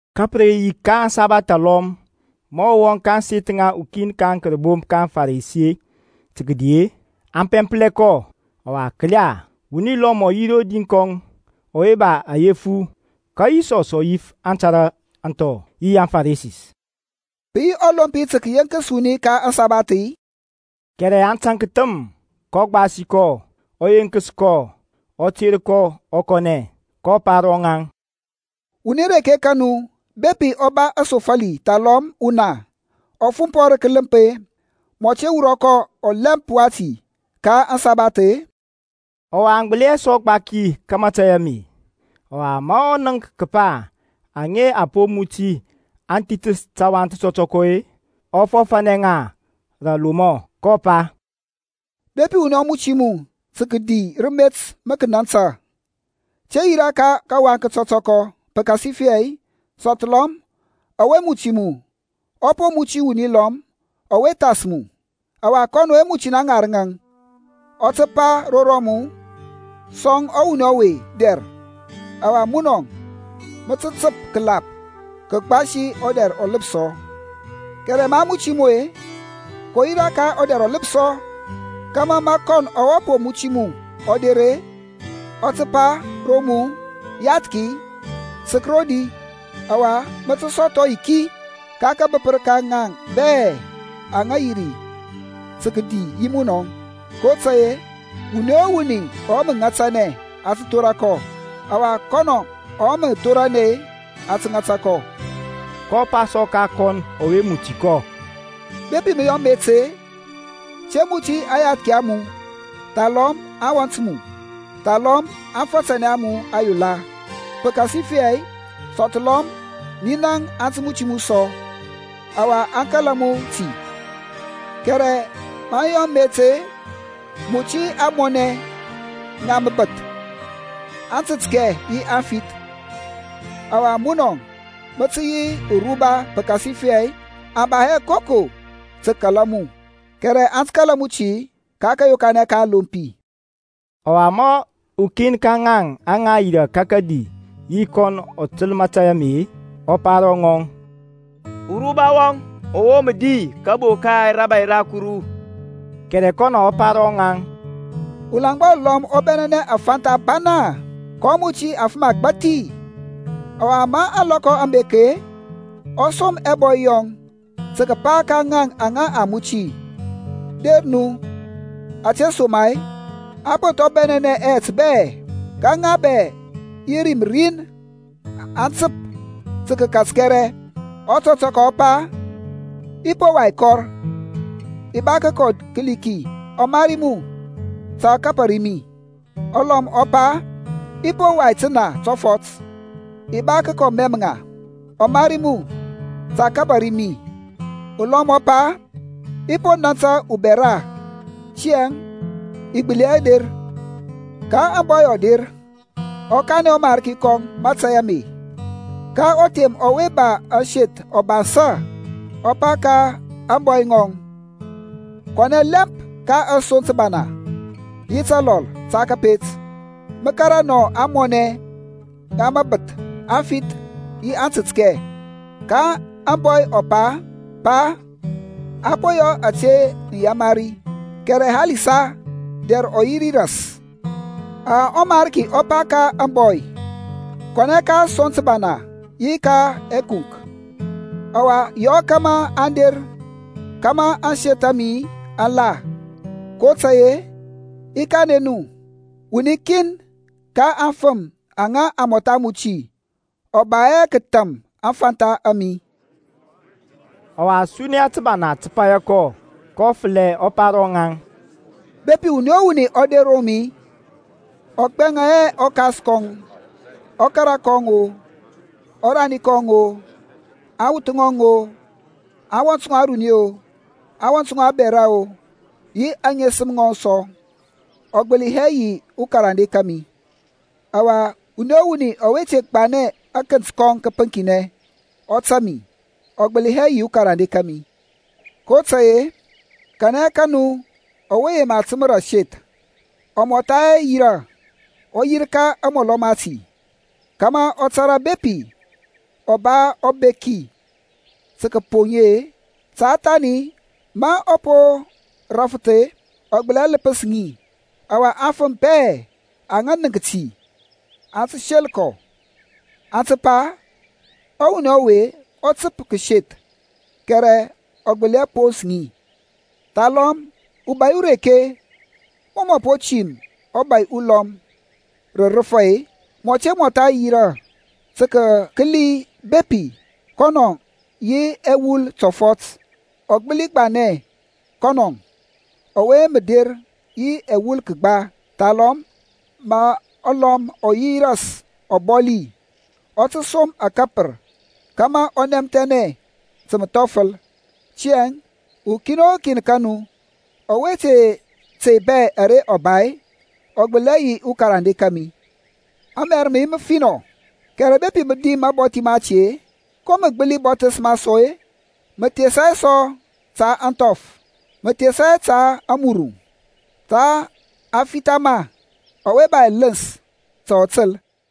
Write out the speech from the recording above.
Ka pə re yi ka asabath alɔm ma ɔ wɔŋ ka ȧŋseth ŋa ukin ka aŋkərbomp ka aŋFarisi tə kədi-e, aŋ pɛmplɛ kɔ. Ɔwa kəla, wuni lɔm ɔ yi rodi kɔŋ ɔwe ba ayefu. Ka Yisɔs ɔ yif aŋtara aŋthɔ yi aŋFarisi, Pə yi ɔlompi tə kəyeŋkəs wuni ka ȧŋsabath-i? Kɛrɛ aŋ taŋk thəm. Kɔ gbasi kɔ, ɔ yenkəs kɔ, ɔ ter kɔ ɔ kɔnɛ. kɔ pa ro ŋaŋ, Wuni reke ka nu bepi ɔ ba asofali thalɔm una ɔ fumpɔ rə kələmp-e, mɔ te wurɔ kɔ ɔlɛmp wati ka asabath-i? Ɔwa aŋ gbəli hɛ sɔ gbaki ka mȧtȧy ame. Ɔwa ma ɔ nənk kəpa aŋa a po muti aŋ thithəs tawaŋ tətɔtɔkɔ-e, ɔ fɔfȧnɛ ŋa rə alomɔ, kɔ pa, Bepi wuni ɔ muti mu tə kəkɔ rə met ma kənantə, te yirȧ ka kawaŋ kətɔtɔkɔ, pəkasifɛ sɔthlɔm ɔwe muti mu ɔ po muti wuni lɔm ɔwe thas mu, ɔwa kɔn ɔwe muti na ŋarəŋȧŋ ɔ tə re pa ro mu, Sɔŋ ɔwuni ɔwe dɛr. Ɔwa munɔ mə tə təp rə məlap kəgbasi ɔdɛr ɔləpsɔ. Kɛrɛ ma a muti mu-e, kɔ yirȧ ka ɔdɛr ɔləpsɔ, kȧmȧ ma kɔn ɔwe po muti mu ɔ der-e, ɔ tə pa ro mu, Yathki, sək rodi; ɔwa mə tə sɔthɔ yiki ka kabəpər ka ŋa bɛ aŋa yirȧ tə kədi yi munɔŋ. kotȧy-e, wuni o wuni ɔwe mə ŋatanɛ a tə thora kɔ, ɔwa kɔnɔ ɔwe mə thoranɛ a tə ŋata kɔ. kɔ pa sɔ ka kɔn ɔwe muti kɔ, Bepi mə yɔ met-e, te muti aŋyathki a mu, thalɔm aŋwɔnt mu, thalɔm aŋfatanɛ a mu ayola; pəkasifɛ sɔthlɔm ninaŋ aŋ tə muti mu sɔ, ɔwa a kala mu ti. Kɛrɛ ma mə yɔ met-e, muti ȧŋmɔnɛ, ŋa məbəth, aŋtətkɛ yi aŋfith. Ɔwa munɔ mə tə yi uruba pəkasifɛ aŋ ba hɛ koko tə kəkala mu; kɛrɛ aŋ tə kala mu ti ka kȧyokanɛ ka aŋlompi. Ɔwa ma ukin ka ŋaŋ aŋa yirȧ ka kədi yi kɔnɔ ɔ təl mȧtȧy ame-e, ɔ pa ro ŋɔŋ, Uruba wɔŋ ɔwe mə di kəbo ka rȧbȧy ra Kuru. Kɛrɛ kɔnɔ ɔ pa ro ŋɔŋ, Ulaŋgba ulɔm ɔ bɛnɛnɛ afantha abana, kɔ muti afəm agbȧthi. Ɔwa ma ȧŋlɔkɔ aŋ bek-e, ɔ som ɛbɔy yɔŋ tə kəpa ka ŋaŋ aŋa a muti, Der nu ȧtesoma-e a po thɔŋ bɛnɛnɛ ɛyɛt bɛ. Ka ŋa bɛ yi rim rin aŋ təp tə kəkat kɛrɛ. Ɔtɔtɔkɔ ɔ pa, I po wai kɔr, i ba kəkɔ kəli ki. Ɔmari mu ta ɔ kabari mi. Ulɔm ɔ pa, I po wai təna tɔfɔt, i ba kəkɔ mɛm ŋa. Ɔmari mu ta ɔ kabari mi. Ulɔm ɔ pa, I po nȧntȧ ubɛra, tiyȧŋ i gbəli hɛ der. Ka ȧŋbɔy ɔ der, ɔ kanɛ ɔmarki kɔŋ mȧtȧy ame. Ka ɔthem ɔwe ba ȧŋseth ɔ bansȧ, ɔ pa ka ȧŋbɔy ŋɔŋ, Kɔnɛ lɛmp ka asoŋ təbana yi təlɔl ta kȧpet, mə kȧrȧ nɔ ȧŋmɔnɛ, ŋa məbəth, aŋfith yi aŋtətkɛ. Ka ȧŋbɔy ɔ pa, Pa a po yɔ ȧte mə yamari, kɛrɛ halisa dɛr ɔ yi ri ras. Ɔwa ɔmarki ɔ pa ka ȧŋbɔy, Kɔnɛ ka asoŋ təbana yi ka ɛkunk, ɔwa yɔ kȧmȧ aŋ der kȧmȧ ȧŋseth a mi aŋ la. kotȧy-e i kanɛ nu, wuni kin ka aŋfəm aŋa a mɔtha muti ɔ ba hɛ kətham aŋfantha a mi. Ɔwa suniya təbana tə paya kɔ, kɔ fəlɛ ɔ pa ro ŋaŋ, Bepi wuni o wuni ɔ der ro mi, ɔ gbɛŋa hɛ ɔkas kɔŋ-o, ɔkara kɔŋ-o, ɔrani kɔŋ-o, aŋwuth ŋɔŋ-o, aŋwɔnt ŋɔŋ aruni-o, aŋwɔnt ŋɔŋ abɛra-o yi aŋesəm ŋɔŋ sɔ-e, ɔ gbəli hɛ yi ukarande kȧmi. Ɔwa wuni o wuni ɔwe te gbanɛ akənt kɔŋ kəpəŋkinɛ, ɔ tȧŋ mi, ɔ gbəli hɛ yi ukarande kȧmi. kotȧy-e, kanɛ ka nu ɔwe yema təmȧ aseth, ɔ mɔtha hɛ yirȧ, ɔ yirka amɔlɔ mati, kȧmȧ ɔ tȧrȧ bepi ɔ ba ɔbeki tə kəpoŋ ŋi-e? Ta thani ma ɔ po rafəth-e, ɔ gbəli hɛ ləpəs ŋi, ɔwa aŋfəm bɛ aŋa nənk ti aŋ sel kɔ, aŋ tə pa, Ɔwuni ɔwe ɔ təp kəseth, kɛrɛ ɔ gbəli hɛ pons ŋi. Thalɔm ubȧy ureke, mɔ mɔ po tim ubȧy ulɔm rə rəfa-e, mɔ te mɔtha yirȧ tə kəkəli bepi kɔnɔ yi ɛwul tɔfɔt ɔ gbəli gbanɛ kɔnɔ ɔwe mə der yi ɛwul kəgba. Thalɔm ma ɔlɔm ɔ yi ras ɔbɔli, ɔ tə som akapər kȧmȧ ɔ nɛmthɛnɛ ta məthɔfəl. Tiyȧŋ ukin o kin ka nu ɔwe te tey bɛ ara ɔ ba, ɔ gbəli hɛ yi ukarande kȧmi. Amɛr mə yi məfinɔ, kɛrɛ bepi mə dim mabɔthi mati-e, ko mə gbəli bɔthəs ma sɔ-e? Mə thesa hɛ ta ȧŋthɔf, mə thesa hɛ ta amuruŋ, tha a tə fitha ma. Ɔwe ba ɛləns ta ɔ təl.